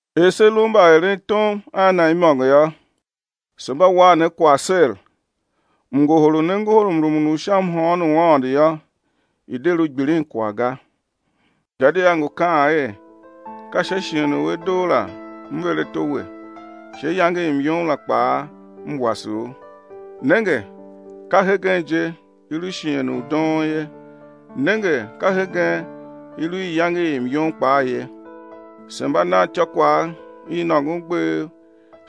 Er se lu mbaerentom a Na imôngo yô, se mba wan ne kwagh ser, mngohol u ne ngohol mrumun u sha mhôôn u Aôndo yô, i̱ de lu gbilinkwagh ga. Gadia ngu kaan er: Ka sha shighe u a doo la M ver ato we, sha iyange i myom la kpaa M wase u. Nenge, ka hegen je i lu shighe u doon ye, nenge ka hegen i lu iyange i myom kpaa ye. Se mba nan ityôkwagh i nôngon gbev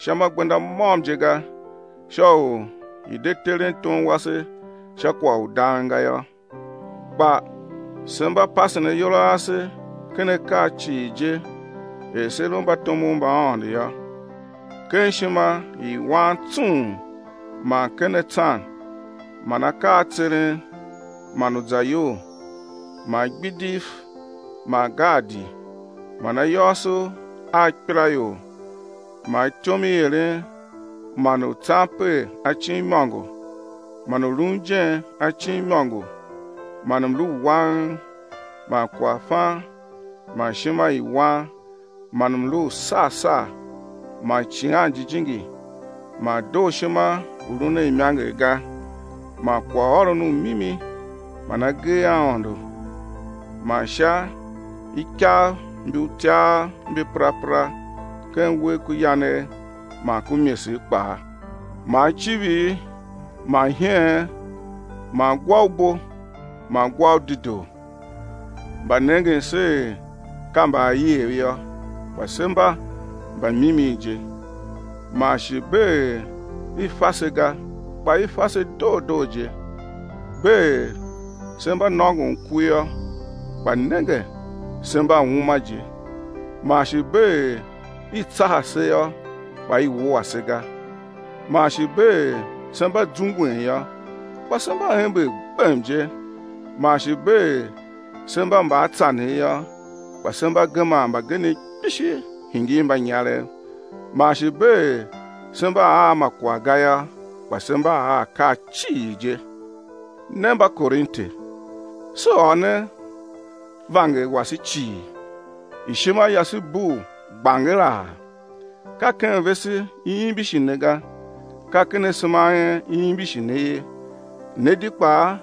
sha ma gbenda môm je ga, sha u i̱ de teren tom wase sha kwagh u dang ga yô, kpa se mba pasen ayol a ase ken akaa cii je er se lu mbatomov mba Aôndo yô: ken ishima i wan tsung, man ken atsan, man akaa a tseren, man uzayol, man igbidiv, man gaadi man ayôôso a ikpelaior, man ityom i eren, man u tsan per acin imôngo, man u lun ijen acin imôngo, man mlu u wang, man kwaghfan, man ishima i wan, man mlu u sar sar, man Icighan Jijingi, man dooshima u lun a imanger ga, man kwaghôron u mimi, man agee a Aôndo, man sha ikav mbi utyav mbi perapera ken uwegh ku yanegh man ku imesegh kpaa, man icivir, man iheen, man gwa u bo, man gwa u dedoo. Mba nengen se er ka mbaaiev yô, kpa se mba mbamimi je; man shi bee er i fa se ga, kpa i fa se doo doo je; bee er se mba nôngon ku yô, kpa nenge, se mba uma je; man shi bee er i tsaha se yô, kpa i wua se ga; man shi bee er se mba zungwen yô, kpa se mba ember gbem je; man shi bee er se mba mbaatsanev yô, kpa se mba geman mbagenev kpishi hingir mbanyarev; man shi bee er se mba a ma kwagh ga yô, kpa se mba a akaa cii je. Ne Mbakorinte, se ôr ne vanger wase cii, ishima yase bugh gbangeraa. Ka ken vese i imbishi ne ga, ka ken asema a en i imbishi ne ye. Ne di kpaa,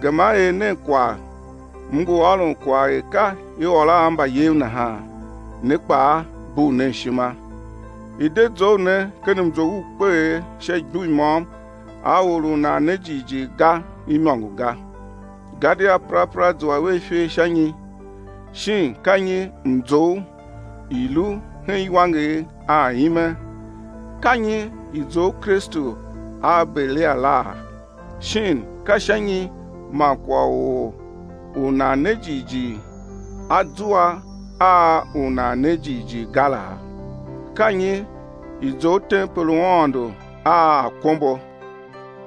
gema er nen kwagh—m ngu ôron kwagh er ka i ôr a mbayev nahan—ne kpaa, bugh nen ishima. I̱ de zough ne ken mzough u kpeegh sha igbur i môm a or u nan ne jighjigh ga, imôngo ga. Gadia perapera zua vea ifer sha nyi? Shin ka nyi mzough i lu hen iwanger a ime? Ka nyi i zough Kristu a Belial la? Shin ka sha nyi man kwagh u or u nan ne jighjigh a zua a u nan ne jighjigh ga laa? Ka nyi i zough tempel u Aôndo a akombo?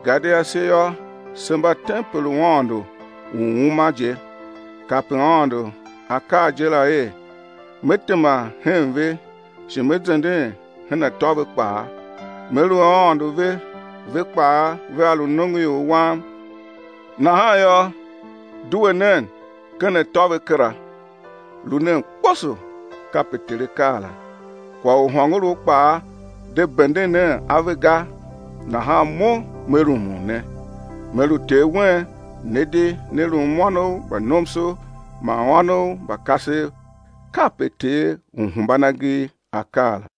Gadia se yô, se mba tempel u Aôndo u uma je. Kape Aôndo A kaa je la er: Me tema hen ve shi Me zenden hen atô ve kpaa, Me lu Aôndo ve, ve kpaa vea lu nongoior Wam. Nahan yô, due nen ken atô ve kera, lu nen kposo, kape Ter A kaa la, kwagh u hôngorough kpaa, de benden nen ave ga. Nahan Mo Me rumun ne, Me lu Ter wen, ne di né lum ônov mba nomso man ônov mba kasev, kape Ter Uhembanagee, A kaa la.